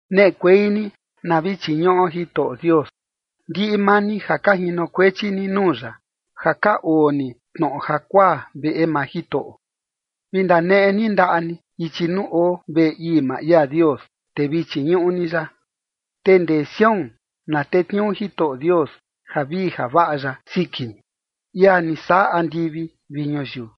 Neꞌekuei ni, na vi chiñuꞌo Jitoꞌo Dios, ndiꞌi maa ni ja ka jinokuechi ni nuu ya, ja ka oo ni tnoꞌo jakuaa veꞌe maa Jitoꞌo. Vi ndaneꞌe ni ndaꞌa ni ichi nuu oo veꞌe ii maa ia Dios, te vi chiñuꞌu ni ya. Te ndee Sión na tetniuu Jitoꞌo Dios javii javaꞌa ya siki ni, ia ni saꞌa andivi vi ñuyiu.